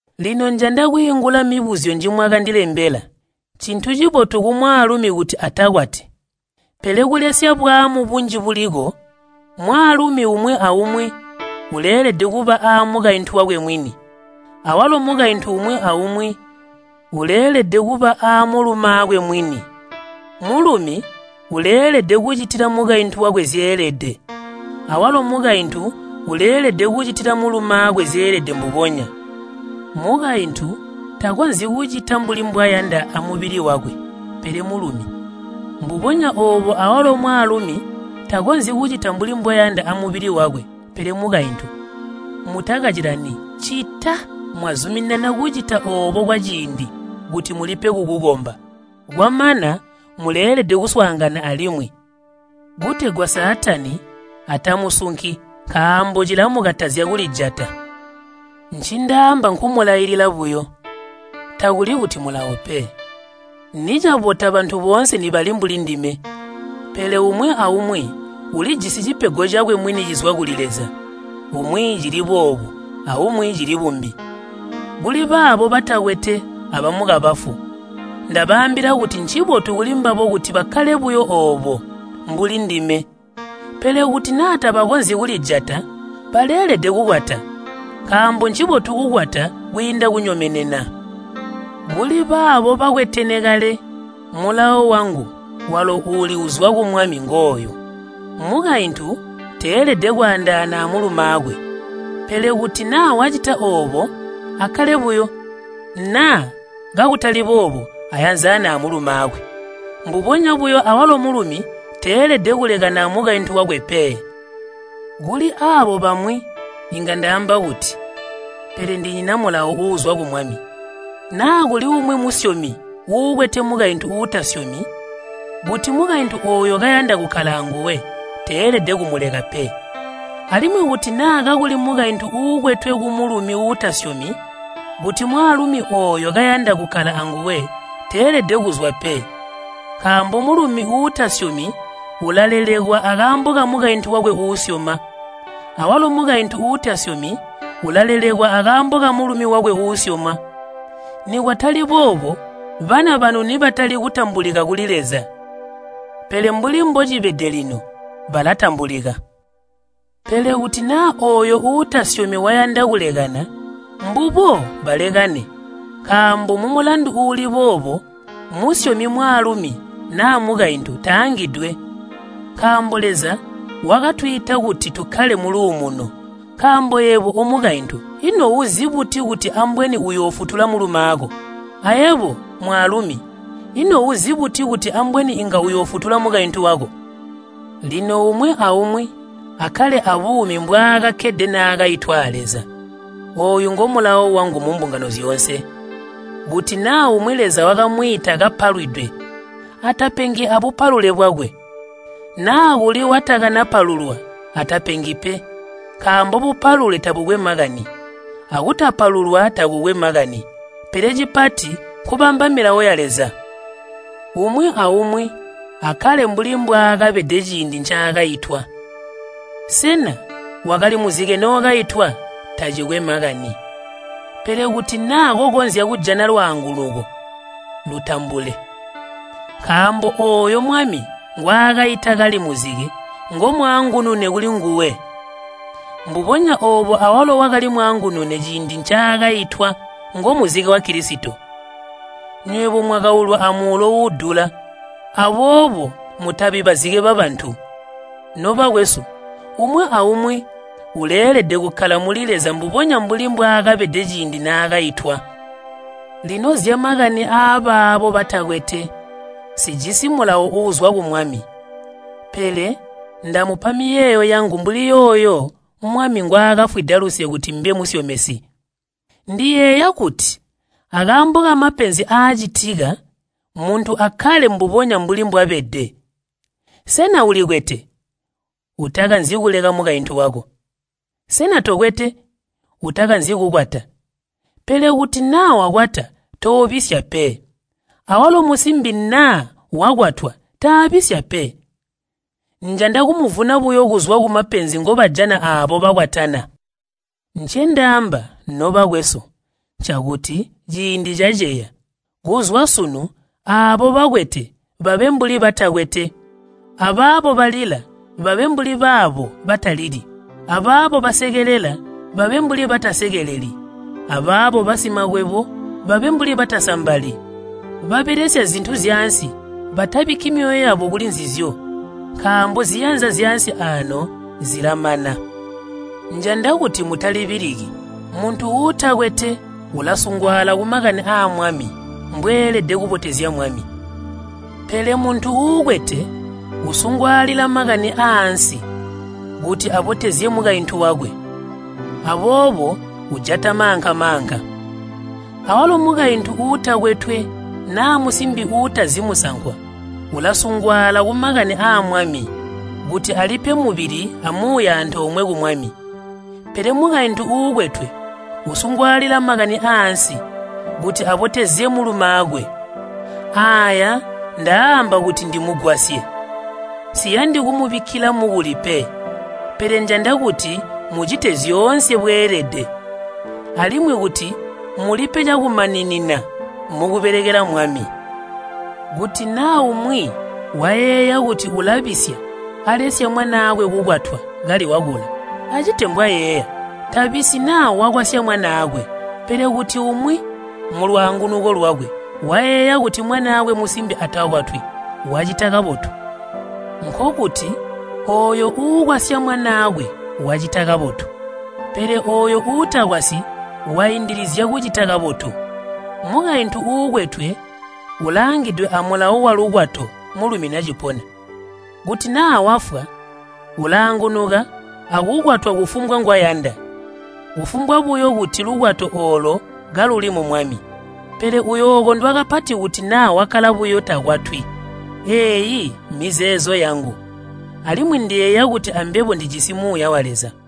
Lino njanda kwiingula mibuzyo njimwakandilembela. Ncintu cibotu kumwaalumi kuti atakwati. Pele kulesya bumambe, mwaalumi umwi aumwi uleelede kuba aamukaintu wakwe mwini, awalo mukaintu umwi aumwi uleelede kuba aamulumaakwe mwini. Mulumi uleelede kucitila mukaintu wakwe zyeelede, awalo mukaintu uleelede kucitila mulumaakwe zyeelede mbubonya. Mukaintu takonzyi kucita mbuli mbwayanda amubili wakwe, pele mulumi. Mbubonya oobo awalo mwaalumi takonzyi kucita mbuli mbwayanda amubili wakwe, pele mukaintu. Mutakacilani ccita mwazuminana kucita oobo kwaciindi, kuti mulipe kukukomba. Kwamana muleelede kuswaangana alimwi, kutegwa Saatani atamusunki nkaambo cilamukatazya kulijata. Ncindaamba nkumulailila buyo, kutali kuti mulawo pe. Nicabota bantu boonse nibali mbuli ndime. Pele umwi aumwi ulijisi cipego cakwe mwini cizwa kuli Leza, umwi cili boobu, aumwi cili bumbi. Kuli baabo batakwete abamukabafu, ndabaambila kuti ncibotu kulimbabo kuti bakkale buyo oobo, mbuli ndime. Pele kuti naa tabakonzyi kulijata, baleelede kukwata. Nkaambo ncibotu kukwata kwiinda kunyomenena. Kuli baabo bakwetene kale mulawo wangu walo uuli uzwa ku Mwami ngooyu, mukaintu teelede kwaandaana amulumaakwe. Pele kuti naa wacita oobo, akkale buyo, naa kakutali boobo ayanzane amulumaakwe. Mbubonya buyo awalo mulumi teelede kulekana amukaintu wakwe pe. Kuli aabo bamwi inga ndaamba kuti, pele ndinyina mulawo uuzwa ku Mwami, naa kuli umwi musyomi uukwete mukaintu uutasyomi, kuti mukaintu ooyo kayanda kukkala anguwe, teelede kumuleka pe. Alimwi kuti naa kakuli mukaintu uukwetwe kumulumi uutasyomi, kuti mwaalumi ooyo kayanda kukkala anguwe, teelede kuzwa pe. Nkaambo mulumi uutasyomi ulalelekwa akaambo kamukaintu wakwe uusyoma, awalo mukaintu uutasyomi ulalelekwa akaambo kamulumi wakwe uusyoma. Nikwatali boobo bana banu nibatali kutambulika kuli Leza, pele mbuli mbocibede lino, balatambulika. Pele kuti naa ooyo uutasyomi wayanda kulekana, mbubo balekane, nkaambo mumulandu uuli boobo musyomi mwaalumi naa mukaintu taangidwe. Nkaambo Leza wakatwiita kuti tukkale muluumuno. Nkaambo yebo, omukaintu, ino uzi buti kuti ambweni uyoofutula mulumaako? Ayebo, mwaalumi, ino uzi buti kuti ambweni inga uyoofutula mukaintu wako? Lino umwi aumwi akkale abuumi mbwaakakkede naakaitwa a Leza. Ooyu ngomulawo wangu mumbungano zyoonse. Kuti naa umwi Leza wakamwiita kapalwidwe, atapengi abupalule bwakwe. Naa kuli watakanapalulwa atapengi pe. Nkaambo bupalule tabukwe makani, akutapalulwa takukwe makani, pele cipati nkubamba milawo ya Leza. Umwi aumwi akkale mbuli mbwaakabede ciindi ncaakaitwa. Sena wakali muzike nookaitwa? Tacikwe makani. Pele kuti naa kokonzya kujana lwaangunuko, lutambule. Nkaambo ooyo Mwami ngwaakaita kali muzike ngomwaangunune kulinguwe. Mbubonya oobo awalo wakali mwaangunune ciindi ncaakaitwa ngomuzike wa Kilisito. Nywebo mwakaulwa amuulo uudula, aboobo mutabi bazike babantu. Nobakwesu, umwi aumwi uleelede kukkala muli Leza mbubonya mbuli mbwaakabede ciindi naakaitwa. Lino zyamakani aabaabo batakwetwe, nsijisi mulawo uuzwa ku Mwami, pele ndamupa miyeeyo yangu mbuli yooyo Mwami ngwaakafwida luse kuti mbe musyomesi. Ndiyeeya kuti akaambo kamapenzi aacitika, muntu akkale mbubonya mbuli mbwabede. Sena ulikwete? Utakanzi kuleka mukaintu wako. Sena tokwete? Utakanzi kukwata. Pele kuti naa wakwata, toobisya pe, awalo musimbi kuti naa wakwatwa taabisya pe. Njanda kumuvuna buyo kuzwa kumapenzi ngobajana aabo bakwatana. Ncendaamba, nobakwesu, ncakuti ciindi caceya. Kuzwa sunu aabo bakwete babe mbuli batakwete, abaabo balila babe mbuli baabo batalili, abaabo basekelela babe mbuli batasekeleli, abaabo basimakwebo babe mbuli batasambali, babelesya zintu zyaansi batabikki myoyo yabo kuli nzizyo. Nkaambo ziyanza zyaansi aano zilamana. Njanda kuti mutalibiliki. Muntu uutakwete ulasungwaala kumakani aa Mwami, mbweelede kubotezya Mwami. Pele muntu uukwete usungwaalila makani aaansi, kuti abotezye mukaintu wakwe, aboobo ujata maanka-maanka. Awalo mukaintu uutakwetwe naa musimbi uutazi musankwa ulasungwaala kumakani aa Mwami, kuti alipe mubili amuuya antoomwe ku Mwami. Pele mukaintu uukwetwe usungwaalila makani aaansi, kuti abotezye mulumaakwe. Aaya ndaaamba kuti ndimugwasye, nsiyandi kumubikkila mukuli pe. Pele njanda kuti mucite zyoonse bweelede, alimwi kuti mulipe cakumaninina mukubelekela Mwami. Kuti naa umwi wayeeya kuti ulabisya alesya mwanaakwe kukwatwa kali wakula, acite mbwayeeya. Tabisyi naa wakwasya mwanaakwe. Pele kuti umwi mulwaangunuko lwakwe wayeeya kuti mwaanakwe musimbi atakwatwi, wacita kabotu. Nkokuti ooyo uukwasya mwanaakwe wacita kabotu, pele ooyo uutakwasyi waindilizya kucita kabotu. Mukaintu uukwetwe ulaangidwe amulawo walukwato mulumi nacipona. Kuti naa wafwa, ulaangunuka akukwatwa kufumbwa ngwayanda, kufumbwa buyo kuti lukwato oolo kaluli mu Mwami. Pele uyookondwa kapati kuti naa wakkala buyo takwatwi. Eeyi mizeezo yangu, alimwi ndiyeeya kuti ambebo ndijisi Muuya wa Leza.